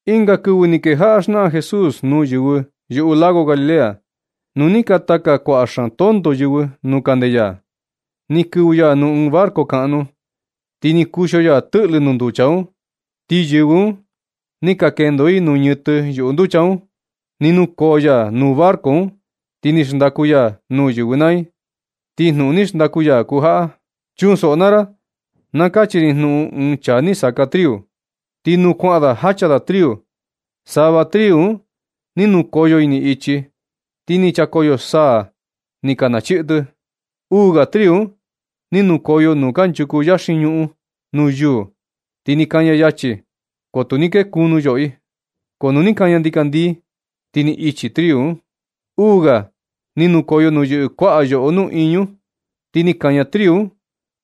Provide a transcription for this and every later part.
Ɨnga kɨvɨ ni kejaꞌa xnaꞌan Jesús nuu yɨvɨ yuꞌu lago Galilea. Nu ni ka taka kuaꞌa xaan tonto yɨvɨ nuu kande ya, ni kɨvɨ ya nuu ɨɨn barco kaꞌnu, ti ni kuxio ya tɨꞌlɨ nuu nducha un. Ti yɨvɨ un ni ka kendo i nuu ñɨtɨ yuꞌu nducha un. Ni nukoo ya nuu barco un ti ni xndaku ya nuu yɨvɨ naa i, ti jnuꞌun ni xndaku ya kuu jaꞌa: ―Chunsoꞌo naa ra na kachi ri jnuꞌun ɨɨn chaa ni saka triu. Ti nuu kuaꞌan da jacha da triu, sava triu un ni nukoyo ini ichi. Ti ni chakoyo saa ni ka nachii tɨ. Uu ga triu un ni nukoyo nuu kanchuku yaxin ñuꞌun nuu yuu ti ni kaña yachi, ko tu ni kee kunu yoꞌo i. Ko nu ni kaña ndikandii, ti ni ichi triu un. Uu ga ni nukoyo nuu yɨꞌɨ kuaꞌa yoꞌo nuꞌiñu, ti ni kaña triu un,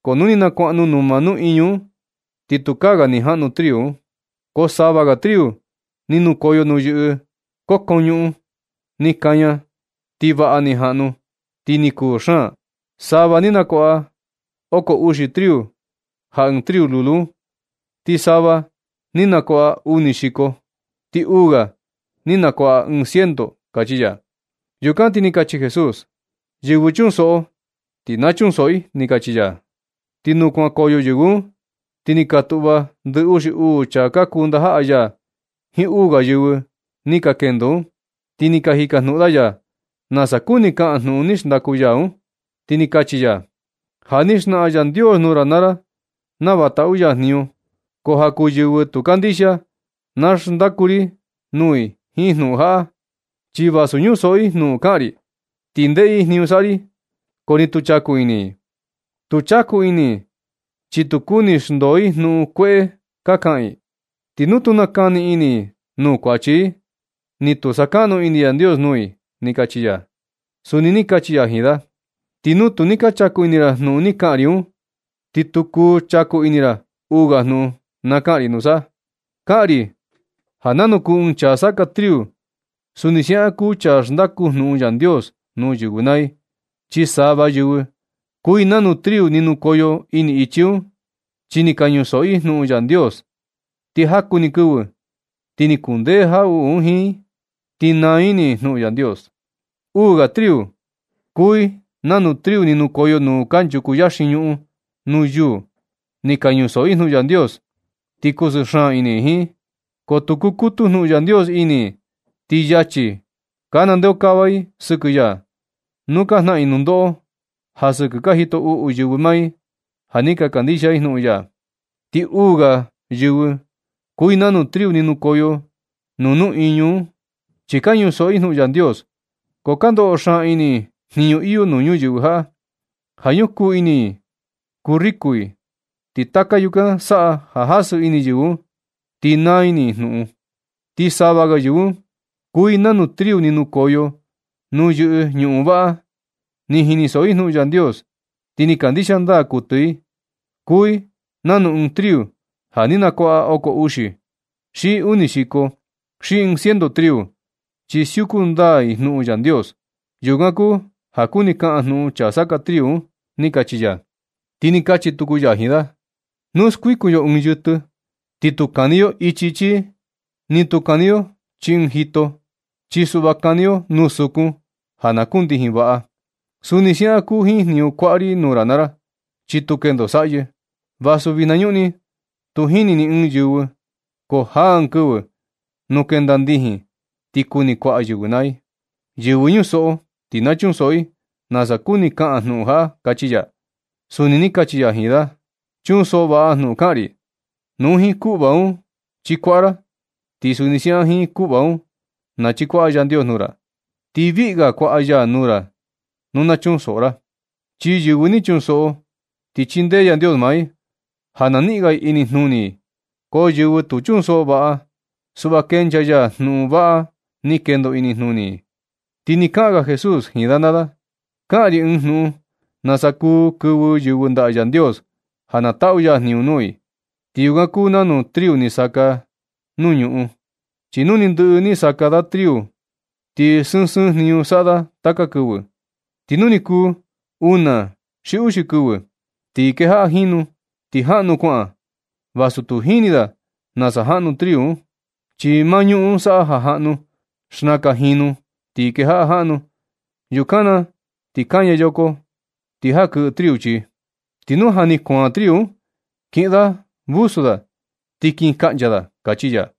ko nu ni nakuaꞌnu numa nuꞌiñu un ti tukaa ni jaꞌnu triu un. Ko sava ga triu ni nukoyo nuu yɨꞌɨ kokon ñuꞌun, ni kaña ti vaꞌa ni jaꞌnu, ti ni kuu xaan. Sava ni nakuaꞌa oko uxi triu ja ɨɨn triu lulu un, ti sava ni nakuaꞌa uni xiko, ti uu ga ni nakuaꞌa ɨɨn ciento ―kachi ya. Yukan ti ni kachi Jesús: ―Yɨvɨ chunsoꞌo ti na chunsoꞌo i ―ni kachi ya. Ti nu kuankoyo yɨvɨ un, ti ni ka tuꞌva ndɨ uxi uu chaa ka kuu ndajaꞌa ya jiin uu ga yɨvɨ ni ka kendo un, ti ni ka jikajnuꞌun da ya nasa kuni kaꞌan jnuꞌun ni xndaku ya un. Ti ni kachi ya: ―Ja ni xnaꞌan Yandios nuu ra naa ra nava taꞌu ya jniñu, ko ja kuu yɨvɨ tu kandixia, na xndaku ri nuu i jiin jnuꞌun jaꞌa. Chi vasu ñusoꞌo i jnuꞌun kaꞌan ri, ti ndeꞌe i jniñu saꞌa ri, ko tu chaku ini i. Tu chaku ini i chi tu kuni xndoo i jnuꞌun kueꞌe ka kaꞌan i. Ti nu tu kuni nakani ini i nuu kuachi i, ti tu sakaꞌnu ini Yandios nuu i ―ni kachi ya. Suni ni kachi ya jiin da: ―Ti nu tu ni ka chaku ini ra jnuꞌun ni kaꞌan ri un, ni tu kuu chaku ini ra uu ga jnuꞌun na kaꞌan ri nusa. Kaꞌan ri ja nanu kuu ɨɨn chaa saka triu, suni siaꞌan kuu chaa xndaku jnuꞌun Yandios nuu yɨvɨ naa i. Chi sava yɨvɨ kuu i nanu triu ni nukoyo ini ichi un, chi ni ka ñusoꞌo i jnuꞌun Yandios, ti jaku ni kɨvɨ ti ni kundee jaꞌuꞌu un jiin i, ti naa ini i jnuꞌun Yandios. Uu ga yɨvɨ kuu i nanu triu ni nukoyo nuu kanchuku yaxin ñuꞌun nuu yuu. Chi ka ñusoꞌo i jnuꞌun Yandios, ti kusɨɨ xaan ini i jiin. Ko tu kukutu jnuꞌun Yandios ini i, ti yachi ka nandeokava i sɨkɨ ya, nuu ka jnaꞌan i nundoꞌo sɨkɨ ja ka jito uꞌu yɨvɨ maa i, ja ni ka kandixia i jnuꞌun ya. Ti uu ga yɨvɨ kuu i nanu triu ni nukoyo nuu iñu un. Chi ka ñusoꞌo i jnuꞌun Yandios. Ko ka ndoꞌo xaan ini i jniñu iyo nuu ñuyɨvɨ jaꞌa, ja ñukuu ini i kuu riko i. Ti taka yukan saꞌa ja jasɨ ini yɨvɨ un, ti naa ini i jnuꞌun un. Ti sava ga yɨvɨ un kuu i nanu triu ni nukoyo nuu yɨꞌɨ ñuꞌun vaꞌa. Ni jinisoꞌo i jnuꞌun Yandios, ti ni kandixia ndaa kuɨtɨ i. Kuu i nanu ɨɨn triu ja ni nakuaꞌa oko uxi, xi uni xiko, xi ɨɨn ciento triu, chi siuku ndaa i jnuꞌun Yandios. Yukan kuu ja kuni kaꞌan jnuꞌun chaa saka triu un ―ni kachi ya. Ti ni kachi tuku ya jiin da: ―Nu skuikun yo ɨɨn yɨtɨ, ti tu kani yo chii ɨɨn cajón, ni tu kani yo chii ɨɨn jito. Chi suꞌva kani yo nuu sukun ja na kundijin vaꞌa. Suni siaꞌan kuu jiin jniñu kuaꞌa ri nuu ra naa ra, chi tu kendo saꞌyɨ. Vasu vijna ñuꞌni tu jini ni ɨɨn yɨvɨ, ko jaa ɨɨn kɨvɨ nu kenda ndijin ti kuni kuaꞌa yɨvɨ naa i. Yɨvɨ ñusoꞌo ti na chunsoꞌo i nasa kuni kaꞌan jnuꞌun jaꞌa ―kachi ya. Suni ni kachi ya jiin da: ―Chunsoꞌo vaꞌa jnuꞌun kaꞌan ri. Nu jiin kuꞌva un chikuaꞌa ra, ti suni siaꞌan jiin kuꞌva un nachikuaꞌa Yandios nuu ra. Ti viꞌga kuaꞌa ya nuu ra nu na chunsoꞌo ra. Chi yɨvɨ ni chunsoꞌo ti chindee Yandios maa i ja na niꞌin ga i inijnuni i. Ko yɨvɨ tu chunsoꞌo vaꞌa, suꞌva kenchaa ya jnuꞌun vaꞌa ni kendo inijnuni i. Ti ni kaꞌan ga Jesús jiin da naa da: ―Kaꞌan ri ɨɨn jnuꞌun nasa kuu kɨvɨ yɨvɨ ndaꞌa Yandios ja na taꞌu ya jniñu nuu i. Ti yukan kuu nanu triu ni saka nuu ñuꞌun. Chi nu ni ndɨꞌɨ ni saka da triu un, ti sɨɨn sɨɨn jniñu saꞌa da taka kɨvɨ. Ti nu ni kuu una uxi kɨvɨ, ti kejaꞌa jinu, ti jaꞌnu kuaꞌan, vasu tu jini da nasa jaꞌnu triu un. Chi maa ñuꞌun un saꞌa ja jaꞌnu. Xnakan jinu ti kejaꞌa jaꞌnu. Yukan na ti kaña yoko ti jakɨꞌɨ triu chii. Ti nu ja ni kuaan triu un, kiꞌin da vusu, ti kin kaꞌncha da ―kachi ya.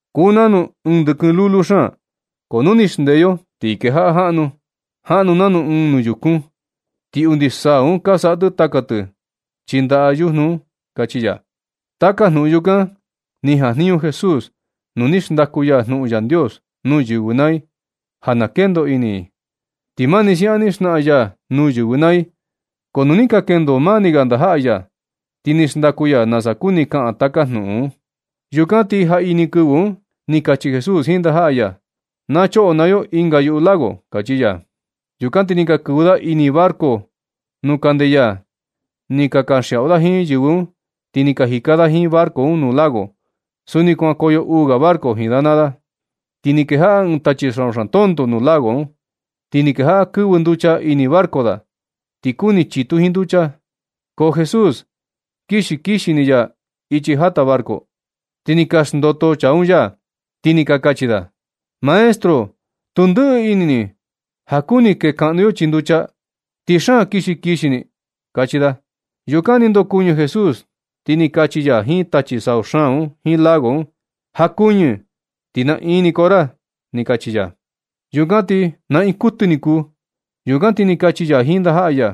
Kuu nanu ɨɨn ndɨkɨn lulu xaan, ko nu ni xndee yo ti kejaꞌa jaꞌnu. Jaꞌnu nanu ɨɨn nuyukun, ti undi saa un ka saꞌa tɨ taka tɨ chii ndaꞌa yujnu un ―kachi ya. Taka jnuꞌun yukan ni jajniñu Jesús nu ni xndaku ya jnuꞌun Yandios nuu yɨvɨ naa i, ja na kendoꞌo ini i. Ti mani siaꞌan ni xnaꞌan ya nuu yɨvɨ naa i. Ko nu ni ka kendo maa ni ga ndajaꞌa ya, ti ni xndaku ya nasa kuni kaꞌan taka jnuꞌun un. Yukan ti jaꞌini kɨvɨ un ni kachi Jesús jiin ndajaꞌa ya: ―Choꞌo naa yo ɨnga yuꞌu lago ―kachi ya. Yukan ti ni ka kɨvɨ da ini barco nuu kande ya. Ni ka kanxiaꞌu da jiin yɨvɨ un ti ni ka jika da jiin barco un nuu lago. Suni kuankoyo uu ga barco jiin da naa da. Ti ni kejaꞌa ɨɨn tachi sau xaan tonto nuu lago un. Ti ni kejaꞌa kɨvɨ nducha ini barco da, ti kuni chitu jiin nducha. Ko Jesús kixi kixi ni ya ichi jata barco. Ti ni ka xndoto chaa un ya, ti ni kachi da: ―Maestro, tu ndɨꞌɨ ini ni ja kuni kekaꞌnu yo chii nducha, ti xaan kixi kixi ni ―kachi da. Yukan ni ndokuɨñɨ Jesús, ti ni kachi ya jiin tachi sau xaan un jiin lago un: ―Jakuñɨ ti naꞌin ni koo ra ―ni kachi ya. Yukan ti naꞌin kuɨtɨ ni ni kuu. Yukan ti ni kachi ya jiin ndajaꞌa ya: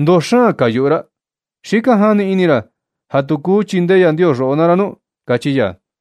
―¿Ndoo xaan ka yuꞌu ra? ¿Xi kaja ni ini ra ja tu kuu chindee Yandios roꞌo naa ra nu? ―kachi ya.